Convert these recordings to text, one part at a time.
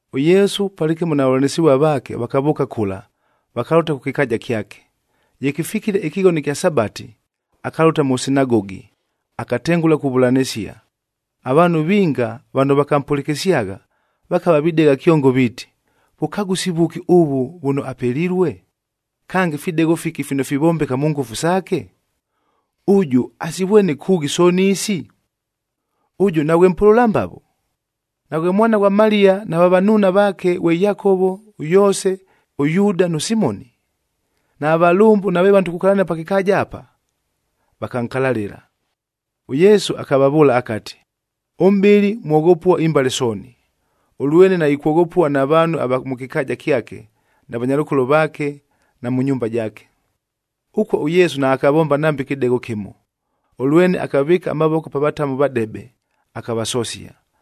ɄYesu palɨkɨmo na vavʉlanɨsɨvua vaake vakavʉʉka kʉla, vakalʉta kʉ kɨkaaja kyake. Ye kɨfikile ɨkɨghono ɨkya Sabati, akalʉta mʉ sinagogi, akatengʉla kuvʉlanɨsia. Avaanhu vinga vano vakampʉlɨkɨsyagha, vakava videgha kyongo viiti, “Vʉkagʉsi vʉki ʉvʉ vʉno apelilue? Kange, fidegho fiki fino fivombeka mʉ ngʉfu saake? Ʉjʉ, asivwene kʉʉghi sooni isi? Ʉjʉ naghwe mpʉlʉla mbavo? Naghwe mwana ghwa Maliya, nava vanuuna vaake ghwe Yakovo, ʉYoose, ʉYuuda nʉ Simoni? Nava valʉmbʉ nave vano tukukalania pa kɨkaaja apa?” Vakankalalɨla. ɄYesu akavavʉʉla akati, “Ʉmʼbɨli mwoghopua imbale sooni, ʉlwene naikwoghopua na vaanhu ava mʉ kɨkaaja kyake na vanyalʉkolo vaake na mʉ nyumba jaake.” Ʉkuo ʉYesu naakavomba nambe kɨdegho kɨmo, ʉlwene akavɨɨka amavoko pa vatamu vadebe, akavasosia.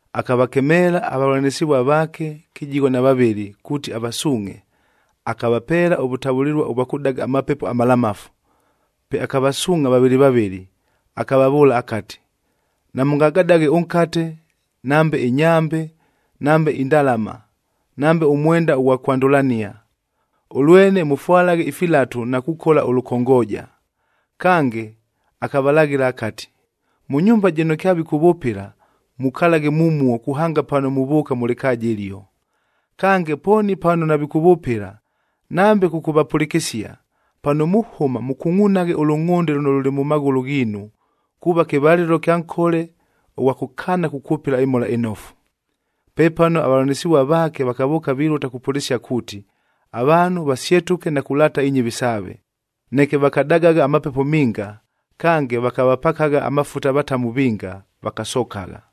Akavakemeela avavʉlanɨsɨvua vaake kɨjigho na vavɨlɨ kuuti avasuungʼhe, akavapeela ʉvʉtavʉlɨlua ʉvwa kʉdaga amapepo amalamafu. Pe akavasuungʼha vavɨlɨ vavɨlɨ, akavavʉʉla akati, “Namʉngagadaghe ʉnkate, nambe ɨnyambe, nambe indalama, nambe ʉmwenda ʉghwa kwandʉlania. Ʉlwene mʉfwalaghe ifilatu na kukola ʉlʉkongooja.” Kange akavalaghɨla akati, “Mʉ nyumba jɨno kyavikʉvʉpɨla mukalaghe mumuo kuhanga pano muvʉʉka mʉ lɨkaaja ɨlio. Kange, pooni pano navikʉvʉpɨla nambe kʉkʉvapʉlɨkɨsia, pano muhʉma mʉkungʼunaghe ʉlʉngʼhʉnde lʉno lʉlɨ mʉ maghʉlʉ ghiinu,a kuuva kɨvalɨlo ɨkya nkole ʉghwa kʉkaana kukwʉpɨla ɨMhola ɨNofu.” Pepano avavʉlanɨsɨvua vaake vakavʉʉka vilʉta kupʉlɨsia kuuti, avaanhu vasyetʉke na kulaata inyɨvi saave. Neke vakadagagha amapepo minga, kange vakavapakagha amafuta avatamu vinga, vakasokagha.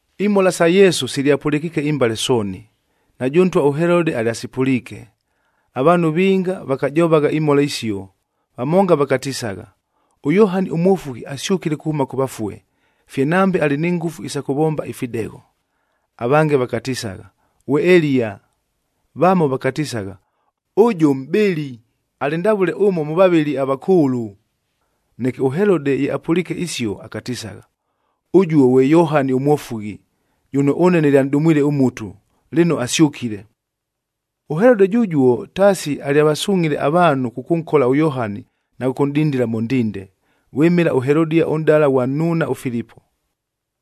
Imhola sa Yesu silyapʉlɨkiike imbale sooni, najʉ ntwa ʉHelodeb alyasipʉliike. Avaanhu vinga vakajovagha imhola isio, vamonga vakatisagha, “ɄYohani ʉMwofughi asyʉkile kuhʉma kʉ vafue, fye nambe alɨ ni ngʉfu isa kʉvomba ifidegho.” Avange vakatisagha, “Ghwe Eliya.” Vamo vakatisagha, “Ʉjʉ mʼbɨli, alɨ ndavʉle ʉmo mʉ vavɨli avakʉʉlʉ.” Neke ʉHelode ye apʉliike isio, akatisagha, “Ʉjʉ ghwe Yohani ʉMwofughi, jʉno ʉne nɨlyanʼdumwile ʉmutu, lɨno asyʉkile!” ɄHelode jʉjuo, taasi alyavasungʼhile avaanhu kʉkʉnkola ʉYohani na kʉkʉnʼdindila mʉ ndinde, vwɨmɨla ʉHelodia ʉnʼdala ghwa nnuuna ʉFilipo.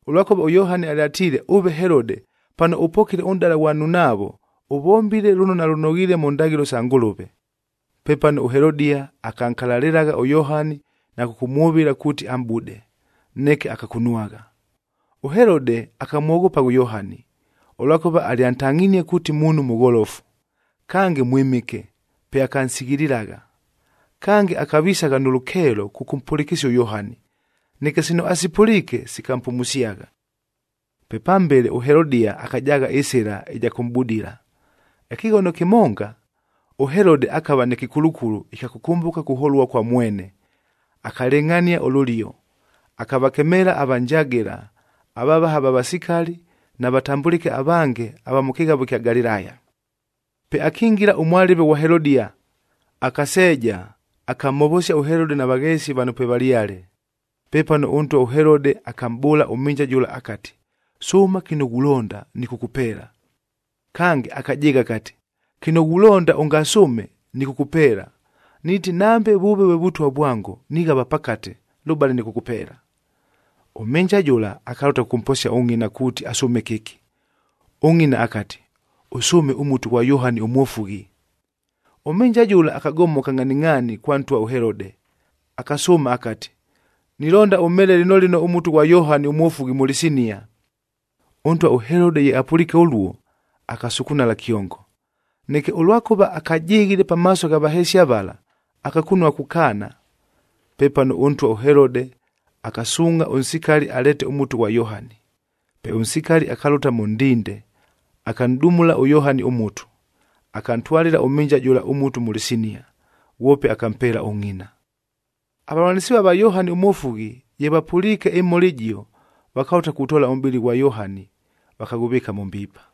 Ʉlwakʉva ʉYohani alyatiile, “Ʉve Helode, pano ʉpokile ʉnʼdala ghwa nnunaavo, ʉvombile lʉno nalʉnoghiile mʉ ndaghɨlo sa Ngʉlʉve.” Pepano ʉHelodia akankalalɨlagha ʉYohani na kʉkʉmwʉvɨla kuuti amʼbude, neke akakunwagha. ɄHelode akamwoghopagha ʉYohani, ʉlwakʉva alyantangʼhinie kuuti muunhu mʉgholofu, kange mwɨmɨke, pe akansighililagha. Kange, akavisagha nʉ lʉkeelo kʉkʉmpʉlɨkɨsia ʉYohani, neke sino asipʉliike, sikampumusyagha. Pe pambele ʉHelodia akajaagha ɨsɨla ɨja kʉmʼbudila. Ɨkɨghono kɨmonga, ʉHelode akava nɨ kɨkulukulu ɨkya kʉkʉmbʉka kuholua kwa mwene, akalɨngʼhania ʉlʉlio, akavakemeela avanjagɨla, avavaha va vasikali na vatambʉlɨke avange ava mʉ kɨghavo ɨkya Galilaya. Pe akingila ʉmwalɨve ghwa Helodia, akaseeja, akamhovosia ʉHelode na vagheesi vano pwevalyale. Pepano ʉntwa ʉHelode akamʼbʉʉla ʉmhɨnja jʉla akati, “Sʉʉma kɨno ghulonda, nɨkʉkʉpeela.” Kange akajɨɨgha akati, “Kɨno ghulonda ʉngasʉʉme, nɨkʉkʉpeela! Niiti, nambe vʉʉve vwe vʉtwa vwango, nighava pakate, lʉbale nɨkʉkʉpeela!” Ʉmhɨnja jʉla akalʉta kʉkʉmposia ʉngʼina kuuti asʉʉme kɨki. Ʉngʼina akati, “Ʉsʉʉme ʉmutu ghwa Yohani ʉMwofughi.” Ʉmhɨnja jʉla akagomoka ngʼhaningʼhaani kwa ntwa ʉHelode, akasʉʉma akati, “Nilonda ʉmheele lɨno lɨno ʉmutu ghwa Yohani ʉMwofughi mʉ lɨsinia.” Ʉntwa ʉHelode ye apʉliike ʉluo, akasukunala kyongo. Neke, ʉlwakʉva akajɨghile pamaaso gha vahesia vala, akakunua kukaana. Pepano ʉntwa ʉHelode akasuungʼha ʉnsikali aleete ʉmutu ghwa Yohani. Pe ʉnsikali akalʉta mʉ ndinde, akanʼdumula ʉYohani ʉmutu, akantwalɨla ʉmhɨnja jʉla ʉmutu mʉ lɨsinia, ghwope akampeela ʉngʼina. Avavʉlanɨsɨvua va Yohani ʉMwofughi, ye vapʉliike ɨmhola ɨjio, vakalʉta kutoola ʉmʼbɨlɨ ghwa Yohani vakaghʉvɨɨka mʉ mbiipa.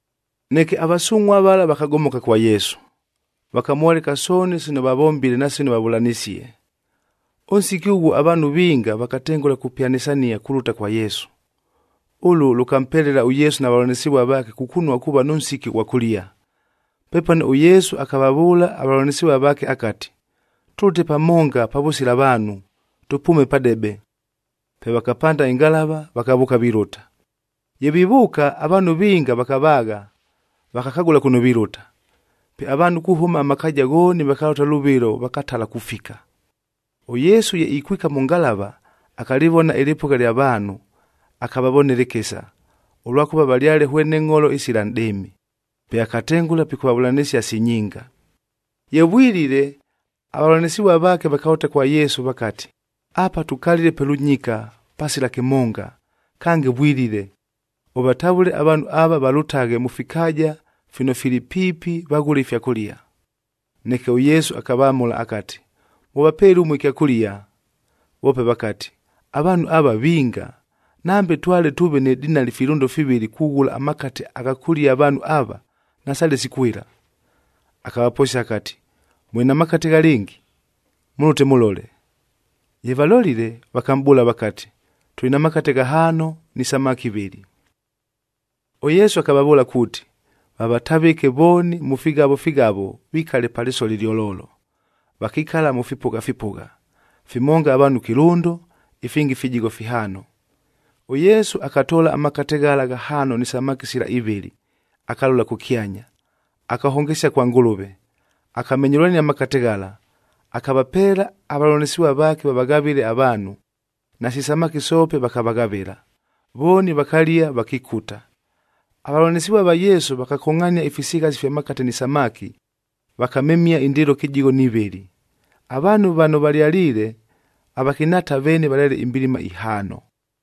Neke avasungʼhuac vala vakagomoka kwa Yesu, vakamwoleka sooni sino vavombile na sino vavʉlanisie. Ʉnsiki ʉghuo avaanhu vinga vakatengʉla kupyanɨsania kulʉta kwa Yesu. Ʉlʉ lʉkampelela ʉYesu na vavʉlanɨsɨvua vaake kukunua kuuva nʉ nsiki ʉghwa kʉlia. Pepano ʉYesu akavavʉʉla avavʉlanɨsɨvua vaake akati, “Tʉlʉte pamonga pavʉsila vaanhu, tʉpʉʉme padebe.” Pe vakapanda ɨngalava vakavʉʉka vilʉta. Ye vivʉʉka, avaanhu vinga vakavaagha, vakakagʉla kʉno vilʉta. Pe avaanhu kuhʉma amakaaja ghooni vakalʉta lʉvɨlo vakatala kufika. ɄYesu ye ikwika mʉ ngalava, akalɨvona ɨlɨpʉgha lya vaanhu, akavavonela ɨkɨsa, ʉlwakʉva valyale hwene ngʼholo isila nʼdɨɨmi. Pe akatengʉla pikʉvavʉlanɨsia si nyinga. Ye vwilile, avavʉlanɨsɨvua vaake vakalʉta kwa Yesu vakati, “Apa tukalile pe lʉnyika pasila kɨmonga, kange vwilile, ʉvatavʉle avaanhu ava valʉtaghe mʉ fikaaja fino fili piipi vaghʉle ifyakʉlia.” Neke ʉYesu akavamʉla akati, “Mʉvapeele ʉmue ɨkyakʉlia.” Voope vakati, “Avaanhu ava vinga! Nambe twale tʉʉve ni dinali filʉndo fivɨlɨd kughʉla amakate agha kʉlia avaanhu ava, nasaale sikwɨla.” Akavaposia akati, “Mʉlɨ na makate ghalɨngi? Mʉlʉte mʉlole.” Ye valolile, vakamʼbʉʉla vakati, “Tʉlɨ na makate ghahaano ni samaki ivɨlɨ.” ɄYesu akavavʉʉla kuuti, vavatavɨke vooni mʉ fighavo fighavo vikale pa lɨsoli ɨlyololo. Vakikala mʉ fipʉgha fipʉgha, fimonga avaanhu kɨlʉndo, ifingi fijigho fihaano. ɄYesu akatoola amakate ghala ghahaano ni samaki sila ivɨlɨ akalola kʉkyanya, akahongesia kwa Ngʉlʉve. Akamenyʉlania amakate ghala, akavapeela avavʉlanɨsɨvua vaake vavaghavɨle avaanhu, nasi samaki soope vakavaghavɨla, vooni vakalia vakikuta. Avavʉlanɨsɨvua va Yesu vakakongʼhania ifisighasi fya makate ni samaki, vakamemia indɨɨlo kɨjigho ni vɨlɨ. Avaanhu vano valyaliile, avakɨnhaata veene valyale imbilima ihaano.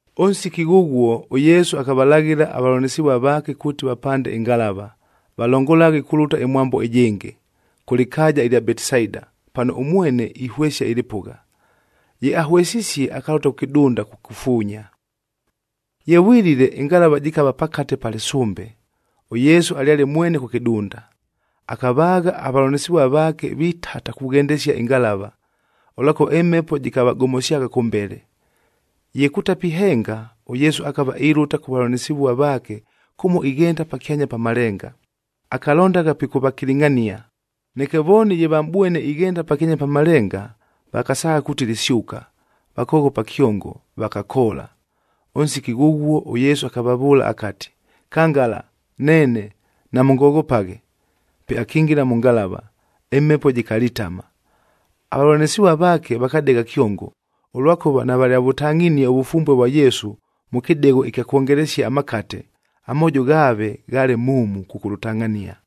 Ʉnsiki ghʉghuo ʉYesu akavalaghɨla avavʉlanɨsɨvua vaake kuuti vapande ɨngalava, valongolaghe kulʉta ɨmwambo ɨjɨngɨ, kʉ lɨkaaja ɨlya Betisaida, pano ʉmwene ihwesia ɨlɨpʉgha. Ye ahwesisie, akalʉta kʉ kɨdunda kukufuunya. Ye vwilile, ɨngalava jɨkava pakate pa lɨsʉmbe, ʉYesu alyale mwene kʉ kɨdunda. Akavaagha avavʉlanɨsɨvua vaake vitata kughendesia ɨngalava, ʉlwakʉva ɨmhepo jɨkavagomosyagha kʉmbele. Ye kutapihenga, ʉYesu akava ilʉta kʉ vavʉlanɨsɨvua vaake kʉmo ighenda pakyanya pa malenga, akalondagha pikʉvakilingʼhania. Neke vooni ye vamʼbwene ighenda pakyanya pa malenga, vakasaagha kuuti lɨsyʉka, vakoghopa kyongo, vakakoola. Ʉnsiki ghʉghuo ʉYesu akavavʉʉla akati, “Kangala, neene, namʉngoghopaghe!” Pe akingila mʉ ngalava, ɨmhepo jɨkalitama. Avavʉlanɨsɨvua vaake vakadegha kyongo, ʉlwakʉva navalyavʉtangʼhinie ʉvʉfumbue vwa Yesu mʉ kɨdegho ɨkya kwongelesia amakate, amoojo ghaave ghaale muumu kʉkʉlʉtangʼhania.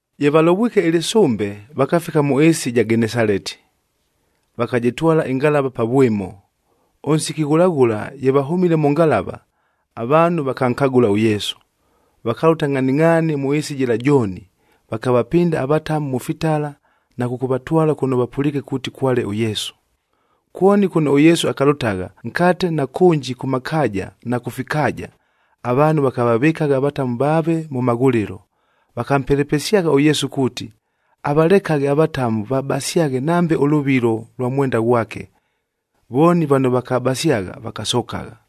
Ye valovwike ɨlɨsʉmbe, vakafika mʉ ɨɨsi ɨja Genesaleti, vakajɨtwala ɨngalava pa vwɨmo. Ʉnsiki ghʉla ghʉla ye vahʉmile mʉ ngalava, avaanhu vakankagʉla ʉYesu, vakalʉta ngʼhaningʼhaani mʉ ɨɨsi jɨla jooni, vakavapɨnda avatamu mʉ fitala na kʉkʉvatwala kʉno vapʉliike kuuti kwale ʉYesu. Kwoni kʉno ʉYesu akalʉtagha nkate na kʉnji kʉ makaaja na kʉ fikaaja, avaanhu vakavavɨkagha avatamu vaave mʉ maghʉlɨlo. Vakampelepesyagha ʉYesu kuuti, avalekaghe avatamu vabasyaghe nambe ʉlʉvilo lwa mwenda ghwake. Vooni vano vakabasyagha, vakasokagha.